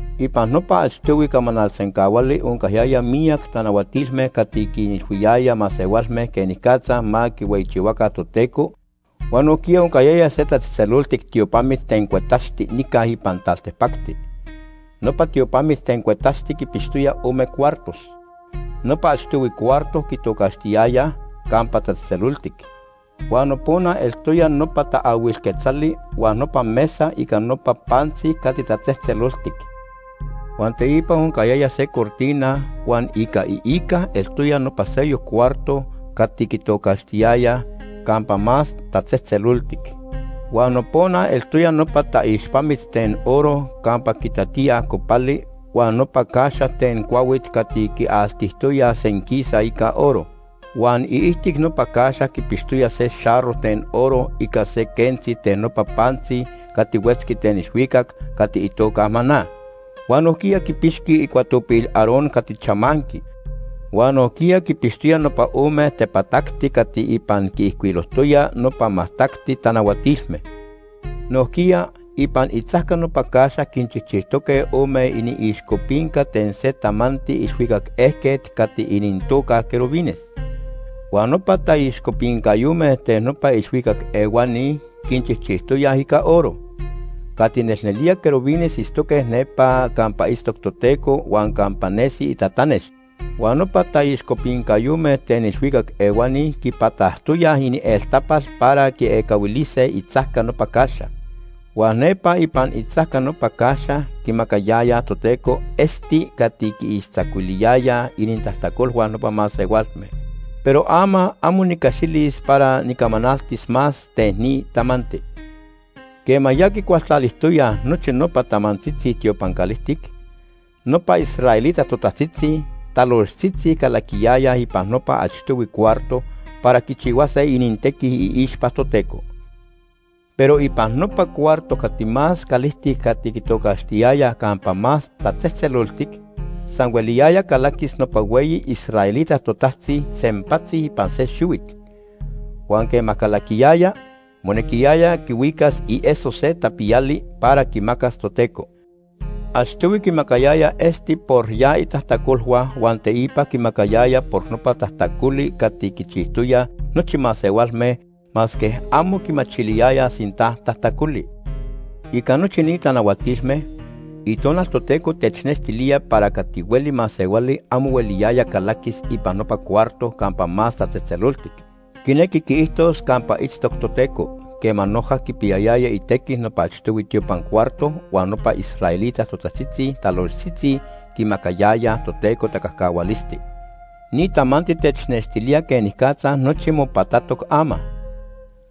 Ipan nopa achtohui camanal sencahuali oncayaya miyac tanahuatilme cati quinilhuiyaya masehualme quenicatza ma quihueyichihuaca Toteco huan nojquiya oncayaya se tatzejtzeloltic tiopamit ten cuetaxti nica ipan taltipacti. Nopa tiopamit ten cuetaxti quipixtoya ome cuartos. Nopa achtohui cuarto quitocaxtiyayaj “Campa Tatzejtzeloltic”, huan nopona eltoya nopa taahuil quetzali huan nopa mesa ica nopa pantzi cati tatzejtzeloltic. Huan teipa oncayaya se cortina huan ica iica eltoya nopa seyoc cuarto cati quitocaxtiyayaj “Campa Más Tatzejtzeloltic”. Huan nopona eltoya nopa taixpamit ten oro campa quitatíaj copali huan nopa caxa ten cuahuit cati quialtijtoyaj senquisa ica oro. Huan iijtic nopa caxa quipixtoya se xarro ten oro ica se quentzi ten nopa pantzi cati huetzqui ten ilhuicac cati itoca maná. Huan nojquiya quipixqui icuatopil Aarón cati chamanqui. Huan nojquiya quipixtoya nopa ome tepatacti cati ipan quiijcuilojtoya nopa majtacti tanahuatilme. Nojquiya, ipan itzajca nopa caxa quinchijchijtoque ome iniixcopinca ten se tamanti ilhuicac ejquet cati inintoca querubines. Huan nopa taixcopincayome ten nopa ilhuicac ehuani quinchijchijtoyaj ica oro. Cati nelnelía querubines itztoque nepa campa itztoc Toteco huan campa nesi itatanex. Huan nopa taixcopincayome ten ilhuicac ehuani quipatajtoyaj inieltapal para quiecahuilise itzajca nopa caxa. Huan nepa ipan itzajca nopa caxa quimacayayaj Toteco esti cati quiixtzacuiliyaya inintajtacolhua nopa masehualme. Pero ama amo nicaxilis para nicamanaltis más ten ni tamanti. Quema ya quicualtalijtoyaj nochi nopa tamantzitzi tiopan calijtic, nopa israelita totajtzitzi talojtzitzi calaquiyayaj ipan nopa achtohui cuarto para quichihuase inintequi iixpa Toteco. Pero ipan nopa cuarto cati más calijtic cati quitocaxtiyayaj Campa Más Tatzejtzeloltic, san hueliyaya calaquis nopa hueyi israelita totajtzi sempatzi ipan se xihuit. Huan quema calaquiyaya, monequiyaya quihuicas ieso se tapiyali para quimacas Toteco. Achtohui quimacayaya esti por ya itajtacolhua huan teipa quimacayaya por nopa tajtacoli cati quichijtoyaj nochi masehualme masque amo quimachiliyayaj sinta tajtacoli. Ica nochi ni tanahuatilme, Itonal Toteco technextilía para cati hueli masehuali amo hueliyaya calaquis ipan nopa cuarto Campa Más Tatzejtzeloltic, quinequi quiijtos campa itztoc Toteco, quema noja quipiyayaya itequi nopa achtohui tiopan cuarto huan nopa israelita totajtzitzi talojtzitzi quimacayayaj Toteco tacajcahualisti. Ni tamanti technextilía quenicatza nochi mopatatoc ama.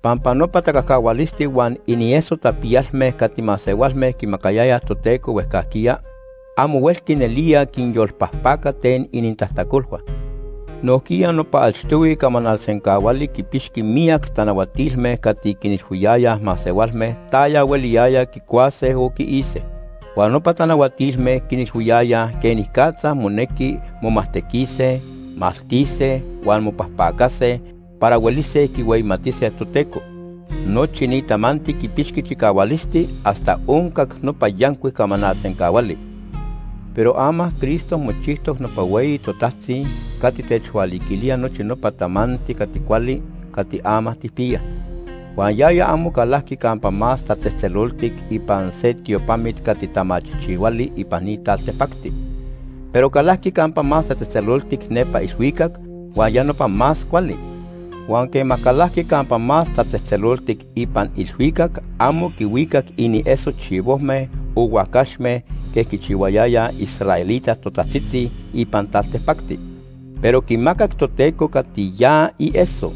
Pampa nopa tacajcahualisti huan inieso tapiyalme cati masehualme quimacayayaj Toteco huejcajquiya, amo huelqui nelía quinyolpajpaca ten inintajtacolhua. Nojquiya nopa achtohui camanal sencahuali quipixqui miyac tanahuatilme cati quinilhuiyayaj masehualme taya hueliyaya quicuase o quiise. Huan nopa tanahuatilme quinilhuiyayaj quenicatza monequi momajtequise, maltise huan mopajpacase para huelise quihueyimatise Toteco. Nochi ni tamanti quipixqui chicahualisti hasta oncac nopa yancuic camanal sencahuali. Pero ama Cristo mochijtoc nopa Hueyi Totajtzi cati techhualiquilía nochi nopa tamanti cati cuali cati ama tijpiyaj. Huan yaya amo calajqui Campa Más Tatzejtzeloltic ipan se tiopamit cati tamachijchihuali ipan ni taltipacti, pero calajqui Campa Más Tatzejtzeloltic nepa ilhuicac huan ya nopa más cuali. Huan quema calajqui Campa Más Tatzejtzeloltic ipan ilhuicac amo quihuicac inieso chivojme o huacaxme quej quichihuayayaj israelita totajtzitzi ipan taltipacti, pero quimacac Toteco cati ya ieso.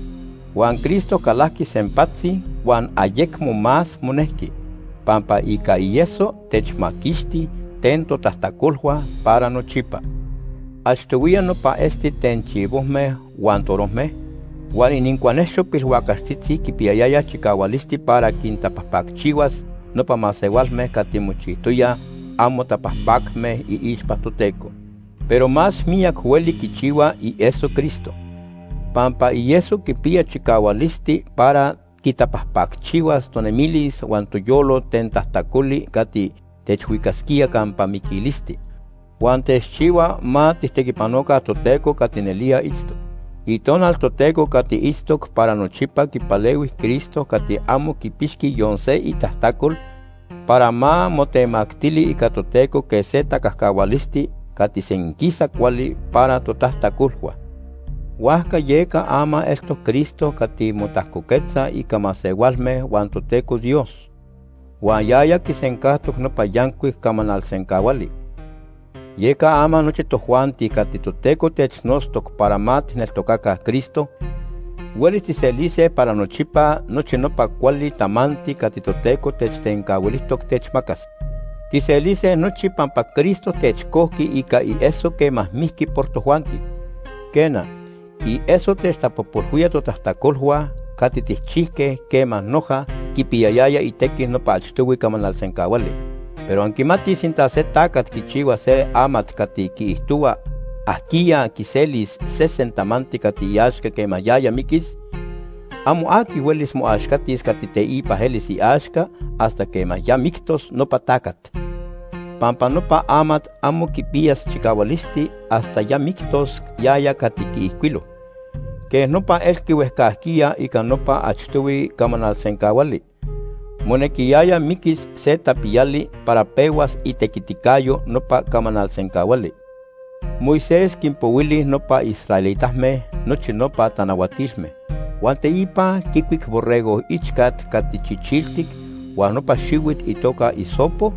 Huan Cristo calajqui sempatzi huan ayecmo más monejqui, pampa ica ieso techmaquixti ten totajtacolhua para nochipa. Achtohuiya nopa esti ten chivojme huan torojme, huan inincuajnexo pilhuacaxtzitzi quipiyayaya chicahualisti para quintapajpacchihuas nopa masehualme cati mochijtoyaj amo tapajpacme iixpa Toteco. Pero más miyac hueli quichihua ieso Cristo, pampa ieso quipiya chicahualisti para quitapajpacchihuas tonemilis huan toyolo ten tajtacoli cati techhuicasquía campa miquilisti. Huan techchihua ma tijtequipanoca Toteco cati nelía itztoc. Itonal Toteco cati itztoc para nochipa quipalehui Cristo cati amo quipixqui yon se itajtacol, para ma motemactili ica Toteco quej se tacajcahualisti cati senquisa cuali para totajtacolhua. Huajca yeca ama eltoc Cristo cati motajcoquetza ica masehualme huan Toteco Dios, huan yaya quisencajtoc nopa yancuic camanal sencahuali. Yeca ama nochi tojuanti cati Toteco technotztoc para ma tijneltocaca Cristo, huelis tijselise para nochipa nochi nopa cuali tamanti cati Toteco techtencahuilijtoc techmacas. Tijselise nochi pampa Cristo techcojqui ica ieso quema mijqui por tojuanti. Quena, ieso techtapojpolhuía totajtacolhua cati tijchijque quema noja quipiyayaya itequi nopa achtohui camanal sencahuali. Pero anquimatij sinta se tacat quichihua se amat cati quiijtohua ajquiya quiselis sesen tamanti cati iaxca quema yaya miquis, amo aqui huelis moaxcatis cati teipa elis iaxca hasta quema ya mictos nopa tacat. Pampa nopa amat amo quipiyas chicahualisti hasta ya mictos yaya cati quiijcuilo. Quej nopa elqui huejcajquiya ica nopa achtohui camanal sencahuali, monequiyaya miquis se tapiyali para pehuas itequiticayo nopa camanal sencahuali. Moisés quinpohuili nopa israelitame nochi nopa tanahuatilme. Huan teipa quicuic borrego ichcat cati chichiltic huan nopa xihuit itoca hisopo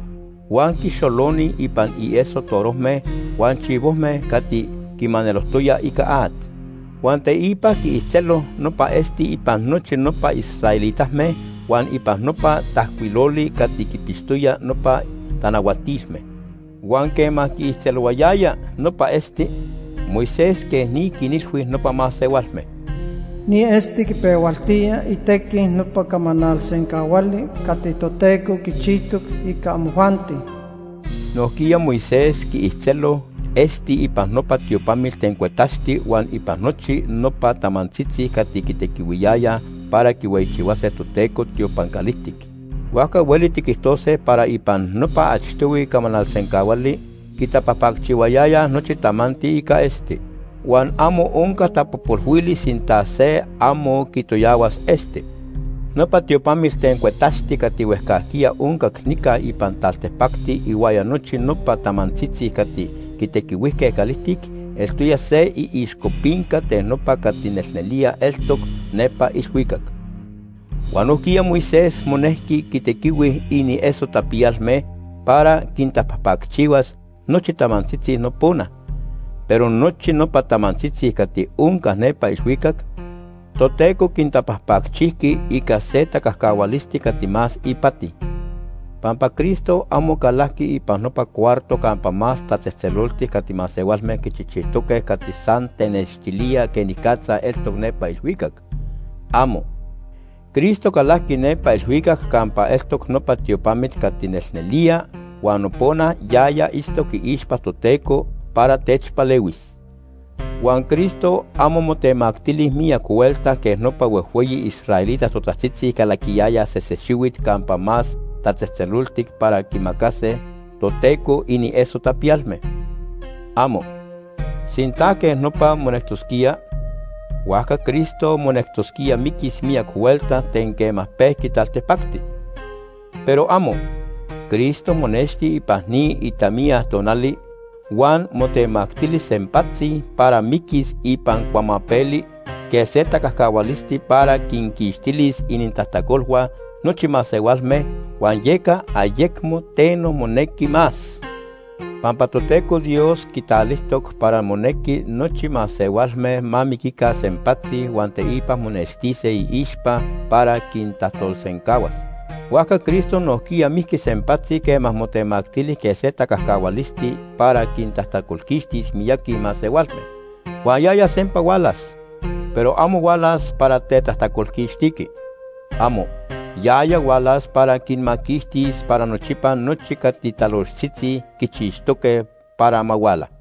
huan quixoloni ipan inieso torojme huan chivojme cati quimanelojtoya ica at. Huan teipa quiijtzelo nopa esti ipan nochi nopa israelitame huan ipan nopa tajcuiloli cati quipixtoya nopa tanahuatilme. Huan quema quiijtzelohuayaya nopa esti, Moisés quej ni quinilhui nopa masehualme: “Ni esti quipehualtía itequi nopa camanal sencahuali cati Toteco quichijtoc ica amojuanti.” Nojquiya Moisés quiijtzelo esti ipan nopa tiopamit ten cuetaxti huan ipan nochi nopa tamantzitzi cati quitequihuiyayaj para quihueyichihuase Toteco tiopan calijtic. Huajca hueli tiquijtose para ipan nopa achtohui camanal sencahuali, quitapajpacchihuayayaj nochi tamanti ica esti. Huan amo onca tapojpolhuili sinta se amo quitoyahuas esti. Nopa tiopamit ten cuetaxti cati huejcajquiya oncac nica ipan taltipacti ihuaya nochi nopa tamantzitzi cati quitequihuijque calijtic eltoya se iixcopinca ten nopa cati nelnelía eltoc nepa ilhuicac. Huan nojquiya Moisés monejqui quitequihui inieso tapiyalme para quitapajpacchihuas nochi tamantzitzi nopona, pero nochi nopa tamantzitzi cati onca nepa ilhuicac, Toteco quintapajpacchijqui ica se tacajcahualisti cati más ipati. Pampa Cristo amo calajqui ipan nopa cuarto Campa Más Tatzejtzeloltic cati masehualme quichijchijtoque cati san technextilía quenicatza eltoc nepa ilhuicac. ¡Amo! Cristo calajqui nepa ilhuicac campa eltoc nopa tiopamit cati nelnelía huan nopona yaya itztoc iixpa Toteco para techpalehuis. Huan Cristo amo motemactili miyac huelta quej nopa huejhueyi israelita totajtzitzi calaquiyayaj sese xihuit Campa Más Tatzejtzeloltic para quimacase Toteco inieso tapiyalme. ¡Amo! Sinta quej nopa monectosquía, huajca Cristo monectosquía miquis miyac huelta ten quema pejqui taltipacti. ¡Pero amo! Cristo monexti ipan ni itamiya tonali huan motemactili sempatzi para miquis ipan cuamapeli quej se tacajcahualisti para quinquixtilis inintajtacolhua nochi masehualme huan yeca ayecmo teno monequi más. Pampa Toteco Dios quitalijtoc para monequi nochi masehualme ma miquica sempatzi huan teipa monextise iixpa para quintajtolsencahuas. Huajca Cristo nojquiya mijqui sempatzi quema motemactili quej se tacajcahualisti para quintajtacolquixtis miyaqui masehualme. Huan yaya sempa hualas, pero amo hualas para tetajtacolquixtiqui. ¡Amo! Yaya hualas para quinmaquixtis para nochipa nochi cati talojtzitzi quichixtoque para ma huala.